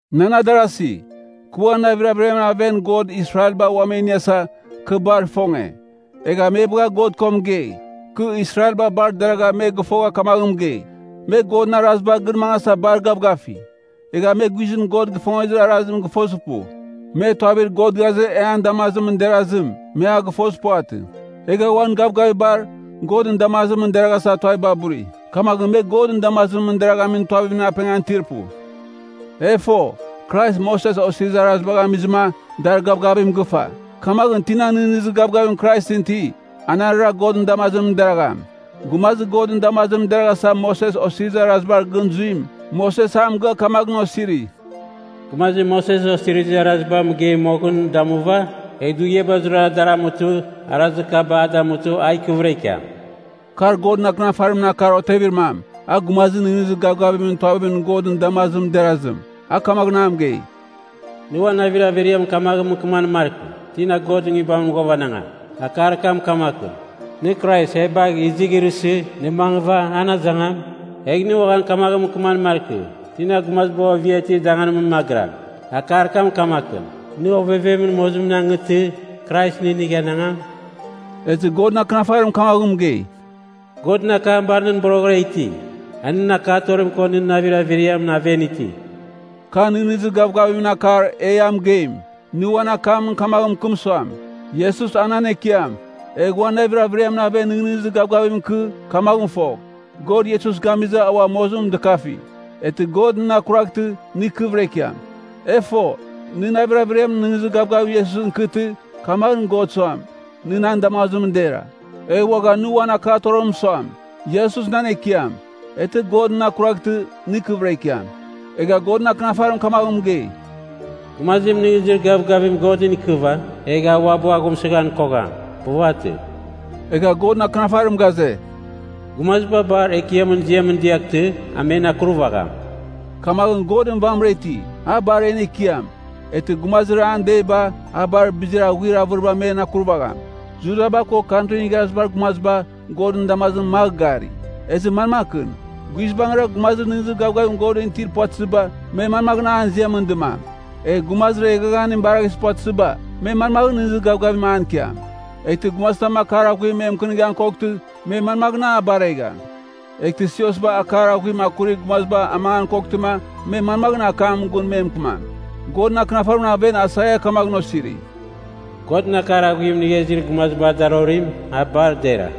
Nan adarasi, kɨ uan navir averiamɨn aven God Israelba ua me iniasa, kɨ bar ifonge! Egha me bagha God ko mɨgei. Kɨ Israelba bar deragha me gɨfogha kamaghɨn mɨgei, me Godɨn arazibar gɨn mangasa bar gavgafi. Egha me guizɨn God ifongezir arazim gɨfozir pu. Me, tuavir God ghaze e an damazimɨn derazim, me a gɨfozir puvatɨ. Egha uan gavgavibar, Godɨn damazimɨn deraghasa tuaviba buri. Kamaghɨn me Godɨn damazimɨn deraghamin tuavimɨn apengan itir pu. E fo, Krais Moses Osirizir Arazibagh amizɨma, dar gavgavim gɨfa. Kamaghɨn, tina nɨghnɨzir gavgavim Kraisɨn iti, anarɨra Godɨn damazimɨn deragham. Gumazir Godɨn damazimɨn deraghasa Moses Osirizir Arazibar gɨn zuim, Moses a mɨgɨa kamaghɨn osiri, “Gumazim Moses Osirizir Araziba mɨgei moghɨn damuva egh dughiaba zurara dar amutɨ, arazir kaba a damutɨ, a ikɨvɨra ikiam.” Kar Godɨn Akɨnafarimɨn akar otevir mam, a gumazir nɨghnɨzir gavgavimɨn tuavimɨn Godɨn damazimɨn derazim, a kamaghɨn a mɨgei, “Nɨ uan navir averiamɨn kamaghɨn mɨkɨmam markɨ, ‘Tina Godɨn nguibamɨn ghuavanangam?’” (Akar kam kamakɨn, nɨ Krais e bagh izighrɨsɨ, nɨ mangɨva an azangam?) “Egh nɨ uaghan kamaghɨn mɨkɨman markɨ, ‘Tina gumazibar ovia itir danganimɨn magɨram?’” (Akar kam kamakɨn, nɨ ovevemɨn mozimɨn angɨ, Krais inigh anangam?) Ezɨ Godɨn Akɨnafarim kamaghɨn mɨgei, “Godɨn akam bar nɨn boroghɨra iti, a nɨn akatorim ko nɨn navir averiamɨn aven iti.” Ka nɨghnɨzir gavgavimɨn akar e ia mɨgeim. Nɨ uan akamɨn kamaghɨn mɨkɨm suam, “Iesus a nan Ekiam,” egh uan navir averiamɨn aven nɨghnɨzir gavgavim ikɨ, kamaghɨn fogh, God Iesus gamizɨ a mozimɨn ua dɨkafi, eghtɨ God nɨn akurvaghtɨ, nɨ ikɨvɨra ikiam. E fo, nɨ navir averiamɨn nɨghnɨzir gavgavim Iesusɨn ikɨtɨ, kamaghɨn God suam, nɨ nan damazimɨn dera. Egh uaghan nɨ uan akatorimɨn suam, “Iesus nan Ekiam,” eghtɨ God nɨn akuraghtɨ, nɨ ikɨvɨra ikiam. Egha Godɨn Akɨnafarim kamaghɨn mɨgei, “Gumazim nɨghnɨzir gavgavim Godɨn ikɨva, egh a uabɨ aghumsɨghan kogham. Puvatɨ.” Egha Godɨn Akɨnafarim ghaze, “Gumaziba bar Ekiamɨn ziamɨn diaghtɨ a men akurvagham.” Kamaghɨn, Godɨn vamɨra iti, a bar en Ekiam. Eghtɨ gumazir an deiba, a bar bizir aghuir avɨriba men akurvagham. Judaba ko Kantrin Igharazibar Gumaziba, Godɨn damazimɨn magh gari. Ezɨ manmakɨn? Guizbangɨra, gumazir nɨghnɨzir gavgavim Godɨn itir puvatɨziba, me manmaghɨn an ziamɨn dɨmam? Egh gumazir eghaghanim baraghizir puvatɨziba, me manmaghɨn nɨghnɨzir gavgavim an ikiam? Eghtɨ gumazitam akar aghuim me mɨkɨnighan koghtɨ, me manmaghɨn a baregham? Eghtɨ siosba akar aghuim akurir gumaziba amangan koghtɨma, me manmaghɨn akamɨn gun me mɨkɨmam? Godɨn Akɨnafarimɨn aven Aisaia kamaghɨn osiri, “Godɨn akar aghuim inigha izir gumazibar darorim, a bar dera.”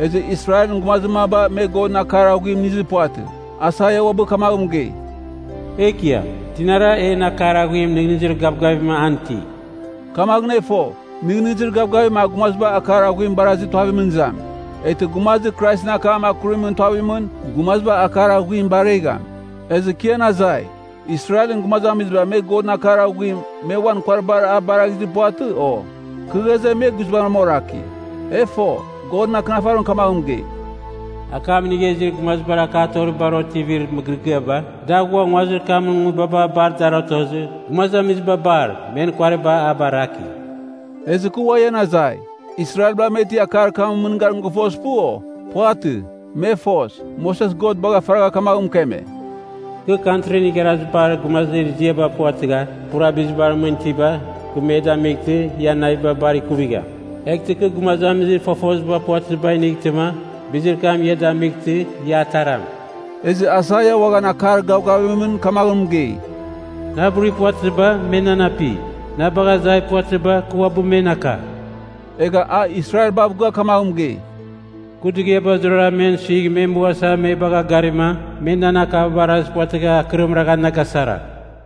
Ezɨ Israelɨn gumazir maba me Godɨn akar aghuim inizir puvatɨ. Aisaia uabɨ kamaghɨn mɨgei, “Ekiam, tinara en akar aghuim nɨghnɨzir gavgavim an iti?” Kamaghɨn e fo, nɨghnɨzir gavgavim a gumaziba akar aghuim barazir tuavimɨn izam. Eghtɨ gumazir Kraisɨn akam akurimɨn tuavimɨn, gumaziba akar aghuim baregham. Ezɨ kɨ ian azai, Israelɨn gumazamiziba me Godɨn akar aghuim, me uan kuariba a baraghizir puvatɨ, o? Kɨ ghaze, me guizbangɨra oraki. E fo, Godɨn Akɨnafarim kamaghɨn mɨgei, “Akam inigha izir gumazibar akatoribar otivir mɨgɨrɨgɨaba, da ghua nguazir kamɨn nguibaba bar dar otozɨ, gumazamiziba bar, men kuariba a baraki.” Ezɨ kɨ ua ian azai, Israelba me ti akar kamɨn mɨngarim gɨfozir pu, o? Puvatɨ. Me fos. Moses God bagha faragha kamaghɨn mɨkeme, “Kɨ Kantrin Igharazibar Gumazir ziaba puvatɨgha pura bizibar mɨn itiba kɨ me inightɨma, ian naviba bar ikuvigham. Eghtɨ kɨ gumazamizir fofoziba puvatɨziba inightɨma, bizir kam ia damightɨ ia ataram.” Ezɨ Aisaia uaghan akar gavgavimɨn kamaghɨn mɨgei, “Na burir puvatɨziba, me nan api. Na bagha azai puvatɨziba, kɨ uabɨ men aka.” Egha a Israelbav gɨa kamaghɨn mɨgei, “Kɨ dughiaba zurara men suigh me mughasa me bagha garima, me nan akaba barazir puvatɨgha akɨrim ragha na gasara.”